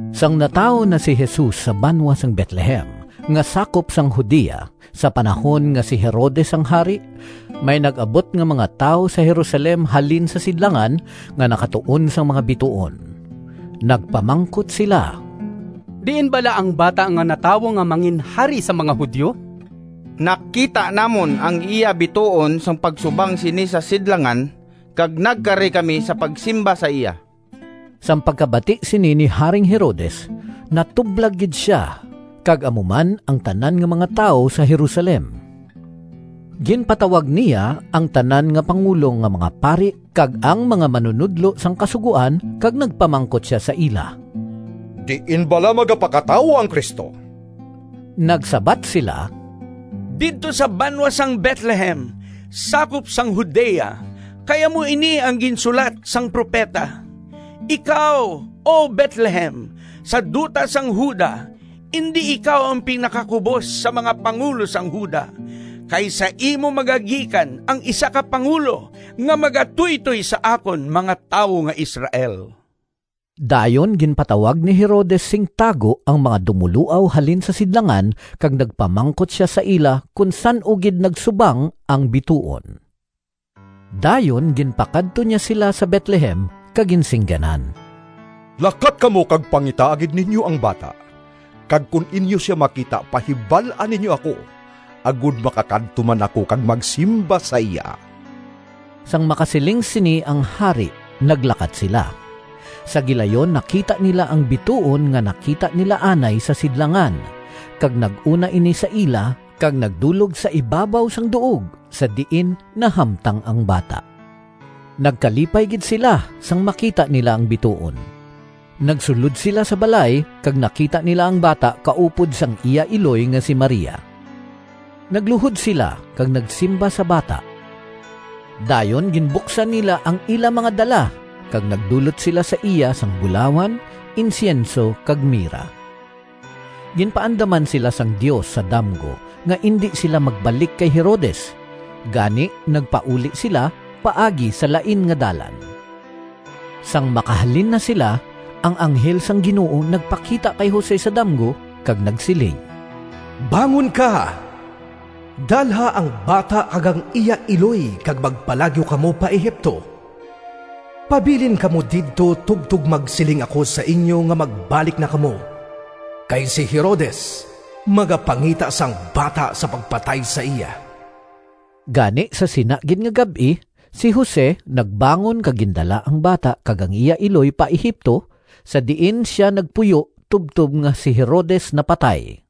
Sang natawo na si Jesus sa banwa sang Betlehem nga sakop sang Judea sa panahon nga si Herodes ang hari, may nag-abot nga mga tawo sa Jerusalem halin sa sidlangan, nga nakatuon sang mga bituon. Nagpamangkot sila, “Diin bala ang bata nga natawo nga manginhari sang mga Judio? Nakita namon ang iya bituon sang pagsubang sini sa sidlangan, kag nagkari kami sa pagsimba sa iya.” Sang pagkabati sini ni Haring Herodes natublag gid sia kag amo man ang tanan nga mga tawo sa Jerusalem. Ginpatawag niya ang tanan nga pangulo nga mga pari kag ang mga manunodlo sang Kasugoan kag nagpamangkot sia sa ila, “Diin bala magapakatawo ang Cristo?” Nagsabat sila, “Didto sa banwa sang Betlehem, sakop sang Judea, kay amo ini ang ginsulat sang propeta: ‘Ikaw, O Betlehem, sa duta sang Juda, Indi ikaw ang pinakakubos Sa mga pangulo sang Juda, Kay sa imo magagikan Ang isa ka pangulo Nga magatuytoy sa akon mga tawo Nga Israel.’” Dayon ginpatawag ni Herodes sing tago ang mga dumoloaw halin sa sidlangan kag nagpamangkot sia sa ila kon san-o gid nagsubang ang bituon. Dayon ginpakadto niya sila sa Betlehem kag ginsingganan, “Lakat kamo kag pangitaa gid ninyo ang bata, kag kon inyo sia makita pahibal-a ninyo ako, agod makakadto man ako kag magsimba sa iya.” Sang makasiling sini ang hari naglakat sila. Sa gilayon nakita nila ang bituon nga nakita nila anay sa sidlangan, kag nag-una ini sa ila kag nagdulog sa ibabaw sang duog sa diin nahamtang ang bata. Nagkalipay gid sila, sang makita nila ang bituon! Nagsulod sila sa balay kag nakita nila ang bata kaupod sang iya iloy nga si Maria. Nagluhod sila kag nagsimba sa bata. Dayon ginbuksan nila ang ila mga dala, kag nagdulot sila sa iya sang bulawan, insyenso, kag mira. Ginpaandaman sila sang Dios sa damgo nga indi sila magbalik kay Herodes; gani nagpauli sila paagi sa lain nga dalan. Sang makahalin na sila, ang anghel sang Ginoo nagpakita kay Jose sa damgo kag nagsiling, “Bangon ka, dalha ang bata kag ang iya iloy kag magpalagyo kamo pa Egipto. Pabilin kamo didto tubtob magsiling ako sa inyo nga magbalik na kamo, kay si Herodes magapangita sang bata sa pagpatay sa iya.” Gani sa sina gid nga gab-i si Jose nagbangon kag gindala ang bata kag ang iya iloy pa Egipto, sa diin sia nagpuyo tubtob nga si Herodes napatay.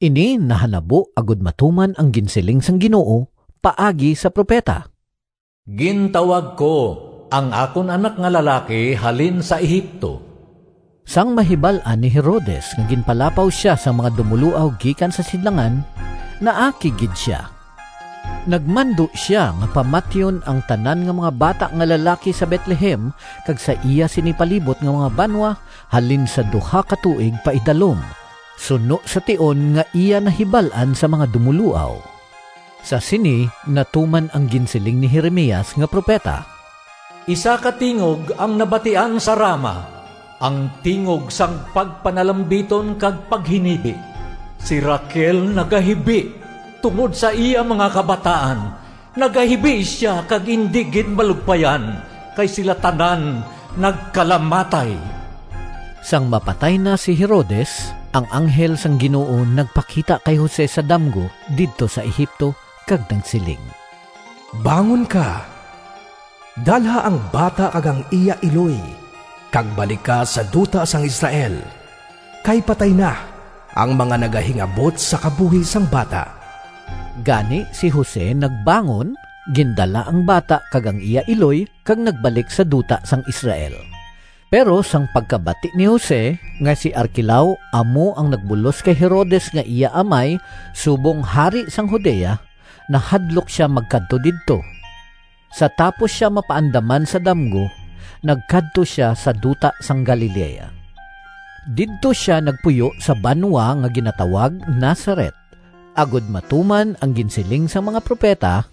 Ini nahanabo agod matuman ang ginsiling sang Ginoo paagi sa propeta, “Gintawag ko ang akon anak nga lalaki halin sa Egipto.” Sang mahibal-an ni Herodes nga ginpalapaw sia sang mga dumoloaw gikan sa sidlangan, naakig gid sia. Nagmando sia nga pamatyon ang tanan nga mga bata nga lalaki sa Betlehem kag sa iya sini palibot nga mga banwa halin sa duha ka tuig paidalom, suno sa tion nga iya nahibal-an sa mga dumoloaw. Sa sini natuman ang ginsiling ni Jeremias nga propeta: “Isa ka tingog ang nabatian sa Rama, Ang tingog Sang pagpanalambiton kag paghinibi. Si Raquel nagahibi Tungod sa iya mga kabataan, Nagahibi sia kag indi gid malugpayan, Kay sila tanan nagkalamatay.” Sang mapatay na si Herodes, ang anghel sang Ginoo nagpakita kay Jose sa damgo didto sa Egipto kag nagsiling, “Bangon ka, dalha ang bata kag ang iya iloy kag balik ka sa duta sang Israel kay patay na ang mga nagahingabot sa kabuhi sang bata.” Gani si Jose nagbangon, gindala ang bata kag ang iya iloy, kag nagbalik sa duta sang Israel. Pero sang pagkabati ni Jose nga si Arquelao amo ang nagbulos kay Herodes nga iya amay subong hari sang Judea, nahadlok sia magkadto didto. Sa tapos sia mapaandaman sa damgo, nagkadto sia sa duta sang Galilea. Didto sia nagpuyo sa banwa nga ginatawag Nazaret, agod matuman ang ginsiling sang mga propeta,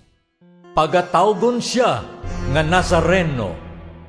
“Pagatawgon sia nga Nazareno.”